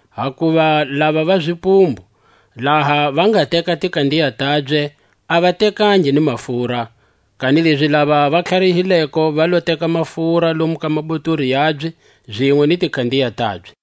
Hakuva lava va zipumbu, laha va nga teka tikandiya tabye, a va tekangi ni mafura; kanilezi lava va tlharihileko va lo teka mafura lomu ka mabotori yabye zinwe ni tikandiya tabye.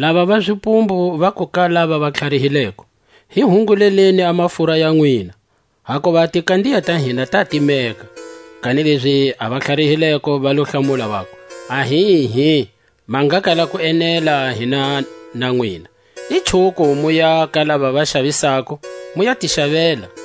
Lava va zipumbu vaku ka lava va tlharihileko: Hi hungululeni a mafura ya nwina, hakuva a tikandiya ta hina ta timeka. Kanilezi a va tlharihileko va lo hlamula, vaku: Ahihi, ma nga kala ku enela hina na nwina. I chuko muya ka lava va xavisako, mu ya ti xavela.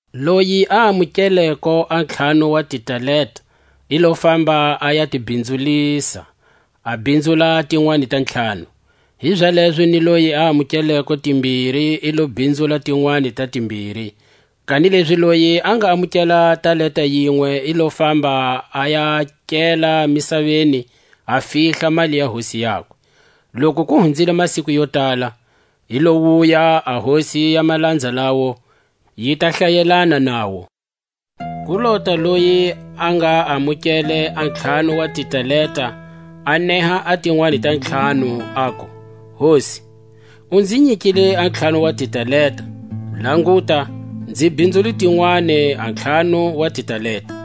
Loyi a amukeleko a ntlhanu wa titalenta, i lo famba a ya ti bhinzulisa, a bhinzula a tinwani ta ntlhanu. Hizalezo ni loyi a amukeleko timbiri i lo bhinzula tinwani ta timbiri. Kanilezi loyi a nga amukele talenta yinwe i lo famba a ya kela misaveni, a fihla mali ya hosi yakwe. Loku ku hunzile masiku yo tala, yi lo wuya a hosi ya malanza lawo, yi ta hlayelana nawo. Ku lota loyi a nga amukele a ntlhanu wa titalenta, a neha a tinwani ta ntlhanu, aku: Hosi, u nzi nyikile a ntlhanu wa titalenta; languta, nzi bhinzule tinwani a ntlhanu wa titalenta.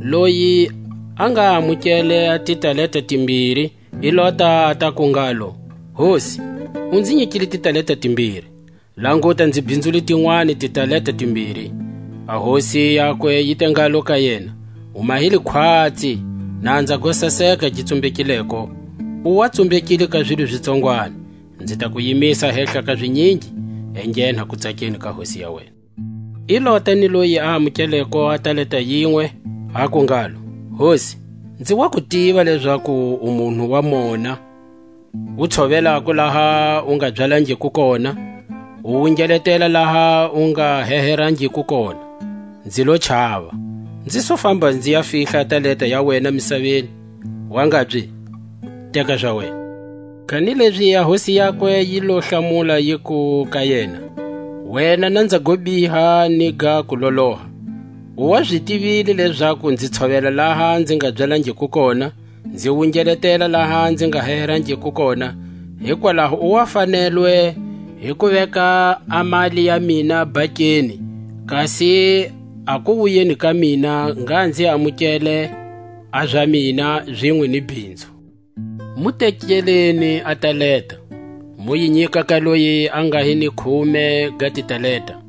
Loyi a nga amukele a titalenta timbiri i lota a ta ku ngalo: Hosi, u nzi nyikile titalenta timbiri; languta, nzi bhinzule tinwani titalenta timbiri. A hosi yakwe yi te ngalo ka yena: U mahile khwatsi, nanza go saseka gi tsumbekileko; u wa tsumbekile ka zilo zi tsongwani, nzi ta ku yimisa hehla ka zinyingi; enghena kutsakeni ka hosi ya wena. I lota ni loyi a amukeleko a talenta yinwe, aku ngalo: Hosi, nzi wa ku tiva lezaku u munhu wa mona, u tshovelako laha u nga byalangiko kona, u wungeletela laha u nga heherangiko kona; nzi lo chava, nzi su famba nzi ya fihla a talenta ya wena misaveni; wangabye, teka za wena. Kanilezi a hosi yakwe yi lo hlamula yiku ka yena: Wena nanza go biha ni ga kuloloha; u wa zi tivile lezaku nzi tshovela laha nzi nga byalangiko kona, nzi wungeletela laha nzi nga heherangiko kona; hikwalaho u wa fanelwe hi ku veka a mali ya mina bhankeni, kasi a kuwuyeni ka mina ngha nzi amukele a za mina zinwe ni bhinzu. Mu tekeleni a talenta, mu yi nyika ka loyi a nga ni khume ga titalenta;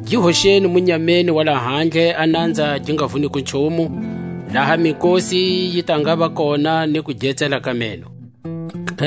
Gi hoxeni munyameni wa lahandle a nanza gi nga vuniko nchumu, laha mikosi yi ta ngava kona ni kuge-tsela ka meno. A kulamulwa, ka matiko.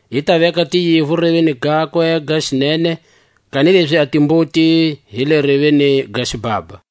I ta veka tiyivu reveni gakwe ga xinene, kanilezi a timbuti hi le reveni ga xibhabha.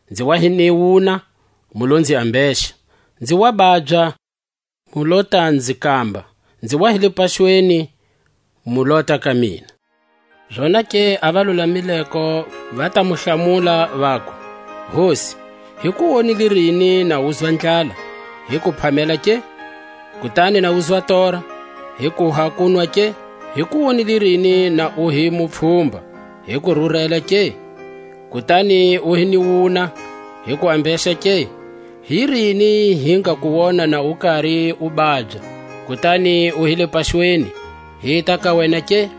nzi wa hi ni wuna, mu lo nzi ambexa; nzi wa babya, mu lo ta nzi kamba; nzi wa hi le paxweni, mu lota ka mina. Zonake a valulamileko va ta mu hlamula, vaku: Hosi, hi ku wonile rini na uzwa ndlala, hi ku phamela ke? kutani na uzwa tora, hi kuha kunwa ke? Hi ku wonile rini na u hi mupfhumba, hi ku rurela ke? kutani u hi ni wuna, hi ku ambexa ke? Hi rini hi nga ku wona na u kari u babya, kutani u hi le paxweni, hita ka wena ke?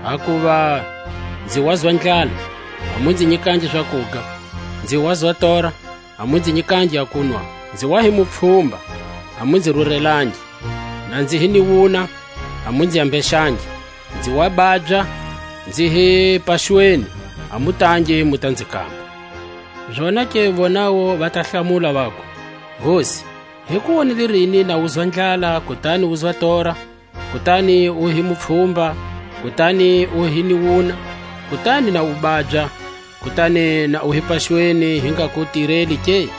hakuva nzi wazwa ndlala, a mu nzi nyikangi zakuga; nzi wazwa tora, a mu nzi nyikangi a kunwa; nzi wa hi mupfhumba, a mu nzi rurelangi; na nzi hi ni wuna, a mu nzi ambexangi; nzi wa babya, nzi hi paxweni, a mu tangi mu ta nzi kamba. Zonake vonawu va ta hlamula, vaku: Hosi, hi ku wonile rini na uzwa ndlala, kutani uzwa tora, kutani u hi mupfhumba, kutani u hi ni wuna, kutani na u babya, kutani na u hi paxweni, hi nga ku tireli ke?